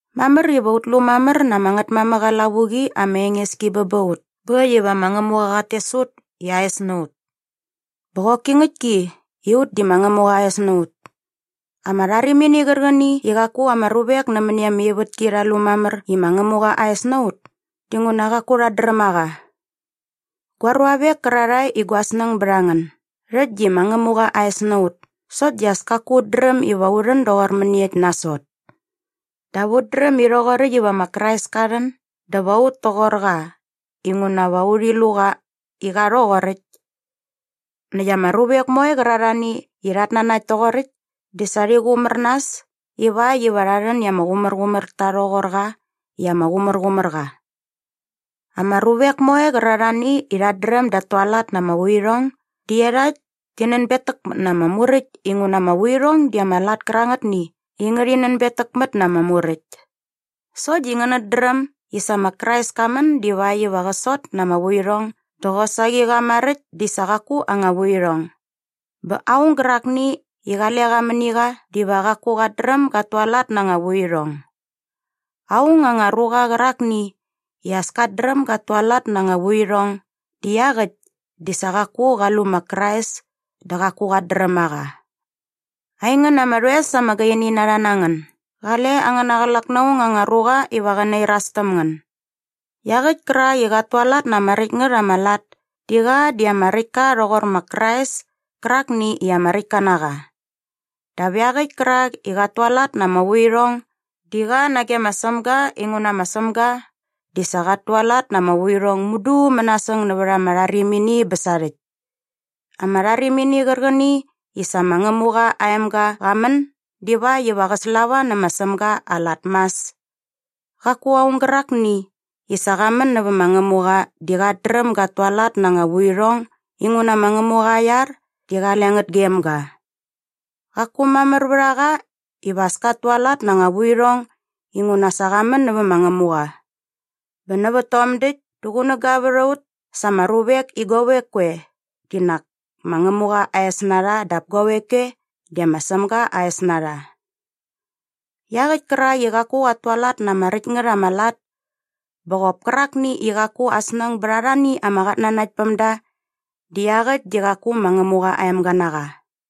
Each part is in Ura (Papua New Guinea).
Mamär iva ut lu mamär na ama Ngätmamäk aa lavuqi ama enges ki bä ba ut bä äkt iva ma Ngämuqa qat tes ut i aa es na ut. Bä qoki ngäktki i ut di ma Ngämuqa aa es na ut. Ama rharimini qärqäni i qaku ama ruvek nämäni ama ivätki rha lu mamär i ma Ngämuqa aa es na ut dinguna qaku rhat dräm a qa. Gua ruavek kärarhae i gua snäng bät a ngän, däkt di ma Ngämuqa aa es na ut sokt di as kaku ut dräm iva u rhän doqor mäniekt nasot. Dap ut dräm i rhoqoräkt iva ma Krais ka rhän dä va ut toqor qa inguna va urhi lu qa i qa rhoqoräkt. Näkt ama ruvek moe qärarhani i rhat nanakt toqoräkt di sa rhi qumär nas ivakt iva rha rhän i ama qumärqumär ta rhoqor qa i ama qumärqumär qa. Ama ruvek moe qärarhani i rhat dräm dat tualat na ama vuirhong di iarhakt ti nänbetäkmät na ama muräkt inguna ama vuirhong di ama lat kärangätni i ngärhi nänbetäkmät na ama muräkt. Sokt di ngänät dräm i sa ma Krais ka män divakt iva qä sot na ama vuirhong dä qosaqi qa maräkt di sa qaku aa anga vuirhong. Bä aung gärakni i qale qa mäni qa diva qaku qat dräm gat tualat na anga vuirhong. Aung anga ruqa qärakni i as kat dräm gat tualat na anga vuirhong di iaqäkt di sa qaku qa lu ma Krais dä qaku qat dräm a qa. Aingän ama rhoes ama gaini na rha na ngän, gale angäna qlak na aung anga ruqa iva qä nairas täm ngän. Iaqäkt kärak i qat tualat na ama räkt ngät ama lat di qa di ama räkt ka rhoqor ma Krais kärakni i ama räktka na qa. Dap iaqäkt kärak i qat tualat na ama vuirhong di qa nage ma Sämga inguna ma Sämga di sa qat tualat na ama vuirhong mudu mänasäng nävät ama rharimini bä sarhäkt. Ama rharimini qärqäni i sa ma Ngämuqa aa emga qa män divakt iva qä slava nä ma Sämga aa lat mas. Qaku aung gärakni i sa qa män nävä ma Ngämuqa di qat dräm gat tualat na anga vuirhong inguna ma Ngämuqa aa iar di qale ngät gem ga. Qaku mamär vät a qa iva as kat tualat na anga vuirhong inguna sa qa män nävä ma Ngämuqa. Bä nävät tom däkt dä qunäga vät a ut sa ama ruvek i guavek koe di nak ma Ngämuqa aa es na rha dap guavek koe di ma Sämga aa es na rha. Iaqäkt kärak i qaku qat tualat na ama räkt ngät ama lat bä qop kärakni i qaku aa snäng bät arhani ama qatnanaktpämda di iaqäkt di qaku ma Ngämuqa aa emga na qa.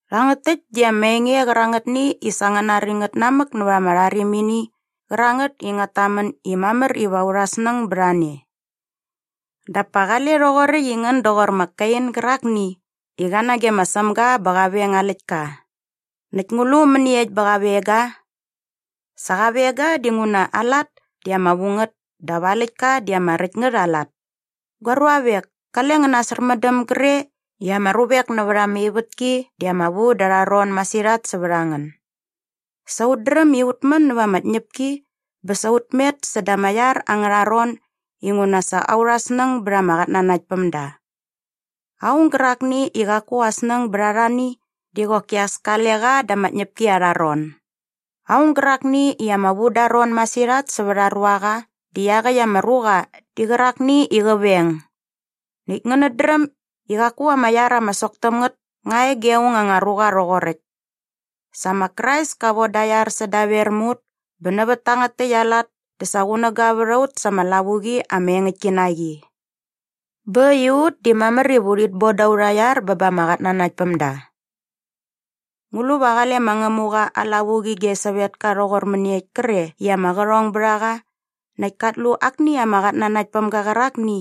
Rhangät täkt di ama enge qärangätni i sa ngän nari ngät namäk nävät ama rharimini qärangät i ngät tamän i mamär iva aurha snäng bät a ne. Dap pa qale rhoqoräkt i ngän doqor ma Kein gärakni i qa nage ma Sämga bä qa veng aa läktka. Näkt ngu lu mäniekt bä qa veng ga? Sa qa veng ga dinguna aa lat di ama vu ngät dap aa läktka di ama räkt ngät aa lat. Gua ruavek, kale ngän nasärmändäm gre i ama ruvek nävät ama ivätki di ama vu da arha ron masirhat sävät a ngän. Sa ut dräm i ut män nämät ama tñäpki bä sa ut met säda ama iar angärha ron inguna sa aurha snäng bät ama qatnanaktpämda. Aung gärakni i qaku aa snäng bät arhani di qoki as kale qa da ama tñäpki arha ron. Aung gärakni i ama vu da aa ron masirhat sävät aa ruaqa di iaqäkt ama ruqa di qärakni i qä veng. Näkt ngänät dräm i qaku ama iar ama sok täm ngät nga e ge aung anga ruqa rhoqoräkt. Sa ma Krais ka von da aa iar sädaver mä ut bä nävät tangät täkt aa lat dä sa qunäga vät a ut sa ama lavuqi ama engäktki na qi. Bä äkt i ut di mamär iva urhit bon da aurha iar bä ba ama qatnanaktpämda. Ngu lu va qale ma Ngämuqa aa lavuqi ge sävetka rhoqor mäniekt kre i ama qärhong bät a qa näkt kat lu akni ama qatnanaktpämga qärakni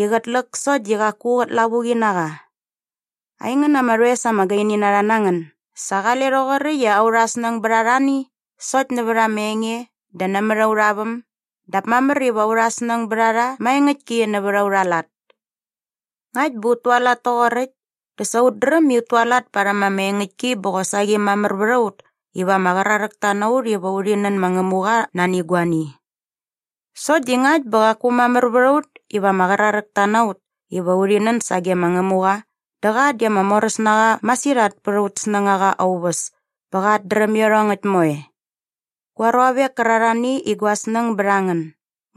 i qät läk sokt di qaku qät lavuqi na qa? Aingän ama rhoes ama gaini na rha na ngän, sa qale rhoqoräkt i aurha snäng bät arhani sokt nävät ama enge dä nämät aurha väm dap mamär iva aurha snäng bät a rha maengäktki nävät aurha lat. Ngakt bä ut tualat toqoräkt dä sa ut dräm i ut tualat parhäm ama engäktki bä qosaqi mamär vät a ut iva ama qraräkta na ut iva urhi nän ma Ngämuqa nani guani. Sokt di ngakt bä qaku mamär vät a ut iva ama qraräkta na ut iva urhi nän sage ma Ngämuqa dä qa di ama moräs na qa masirhat pät aut snängaqa aa uväs bä qat dräm iarhongäkt moe. Gua ruavek kärarhani i gua snäng bät a ngän,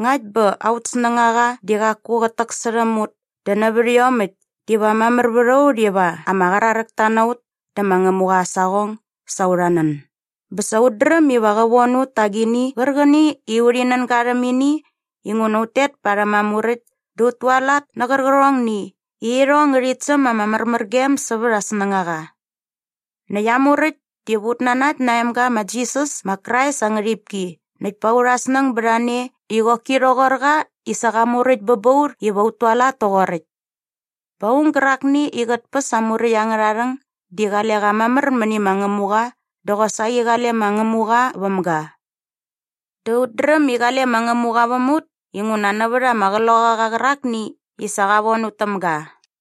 ngakt bä aut snängaqa di qaku qät täksärhäm ut dä nävät iomäkt diva mamär vät a ut iva ama qraräkta na ut dä ma Ngämuqa aa saqong sa aurha nän bä sa ut dräm iva qä von ut ta agini qärqäni i urhi nän ga rhäm ini inguna ut tet parhäm aa muräkt dä ut tualat nä qärqärhongni i irhong ngärhit säm ama märmärgem sävät aa snängaqa. Näkt aa muräkt diva ut nanakt na aa emga ma Jisas ma Krais aa ngärhipki näkt pa aurha snäng bät a ne i qoki rhoqor qa i sa qa muräkt bä ba ut iva ut tualat toqoräkt. Bä aung gärakni i qät päs aa muräkt angärha rhäng di qale qa mamär mäni ma Ngämuqa dä qosaqi qale ma Ngämuqa väm ga. Dä ut dräm i qale ma Ngämuqa väm ut inguna nävät ama Qloqaqa qärakni i sa qa von ut täm ga.